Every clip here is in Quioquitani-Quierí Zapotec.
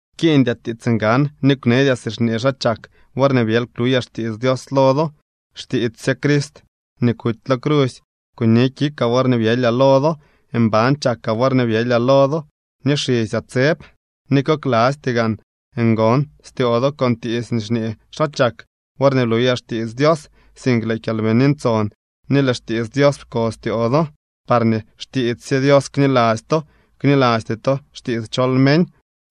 Pkiiñdyaa tiits ngan ni kwneedyaa si xñee xaa chak worñee byely kluyaa xtiits Dios lo do. Xtiits sye Crist nii kuty lo crusy kuni kikaa worñee byelyaa lo do. Mban chakaa worñee byelyaa lo do ni xisyaa tseb, ni koklasty gaan ngon styoo do con tiits nii xñee xaa chak worñee bluyaa xtiits Dios, sink lëë Kyalbini Ntson ni lëë xtiits Dios pko styoo do, parñee xtiits sye Dios kniladzy to, knilasty to xtiits chol meñ.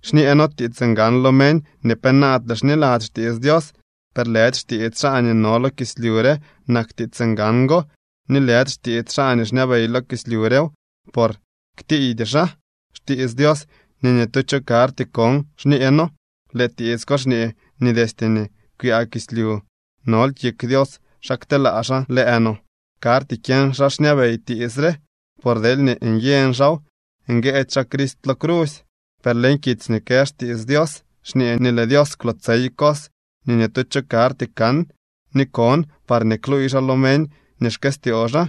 Xñee noo tiits ngan lo meñ nii penaadle xniladzy xtiits Dios. Per lëdy xtiits xaa nii no lo kislyu re nak tiits ngan go ni lëdy xtiits xaa nii xñabey lo kislyu rew, por ktiiydy xaa. Xtiits Dios nii ni tu cho karty kon xñee noo. Lëë tiits ko xñee nii destye nii kwyaa kislyu nol kik Dios xa kteelaa xaa lëë no. Karty kyeñ xaa xñabey tiits re, por deelñee nyeñ xaaw nguëëdy xaa Crist lo crusy. Per leñ kitsy nii kë xtiits Dios xñee nii lëë Dios kwlootsey cos nii ni tu cho karty kan ni kon, parñee kluuy xaa lo meñ nii xkëstyoo xaa.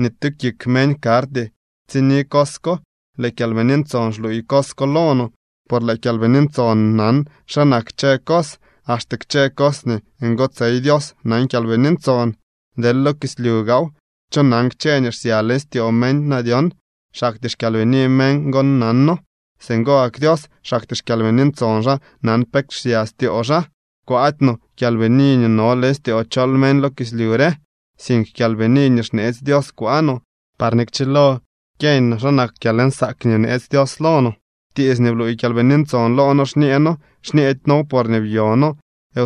Ni tu kik meñ karty tsini cos ko. Lëë Kyalbini Ntson xluuy cos ko lo no, por lëë Kyalbini Ntson nan xa nak kchë cos, axte kchë cos nii ngotsey Dios nan Kyalbini Ntson. Deel lo kislyu gaaw, ¿cho nan kchë nii xsya leñ styoo meñ na dyon? Xaktyee xkyalbini meñ gon nano. Singo gak Dios, xaktyee xKyalbini Ntson xaa nan pe xsya styoo xaa. Kwaady no kyalbini nii no leñ styoo chol meñ lo kislyu re, sink Kyalbini nii xneetsy Dios kwaa no, parñee kchilo kyeeñ no xa nak kyalnsaak nii bneetsy Dios lo no. Tiits nii bluuy Kyalbini Ntson loo noo xñee noo. Xñedy noow porñee byo noo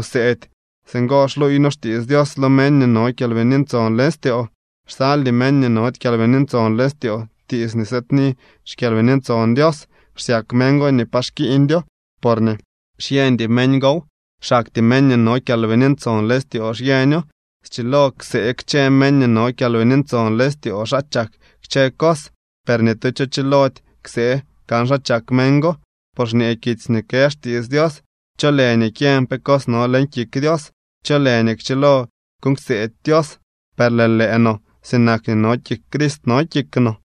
wseedy. Singo xluuy noo xtiits Dios lo meñ nii no Kyalbini Ntson leñ styoo. Xsaldy meñ nii nody Kyalbini Ntson leñ styoo tiits nii sëëdni xKyalbini Ntson Dios. Xsyak meñ go nii pa xkiiñdyoo porñee xyeñdy meñ gow. Xaktyee meñ nii no Kyalbini Ntson leñ styoo xyeño. Schilo ksee kchë meñ nii no Kyalbini Ntson leñ styoo xa chak kchë cos, per ni tu cho chilody ksee kan xa chak meñ go. Por xñee kitsy nii kë xtiits Dios: “¿Cho lë nii kyeñ pe cos no leñ kik Dios? ¿Cho lë nii kchilo kuuñ kseedy Dios?” Per lëë lëë no sinak nii no kik Crist no kik no.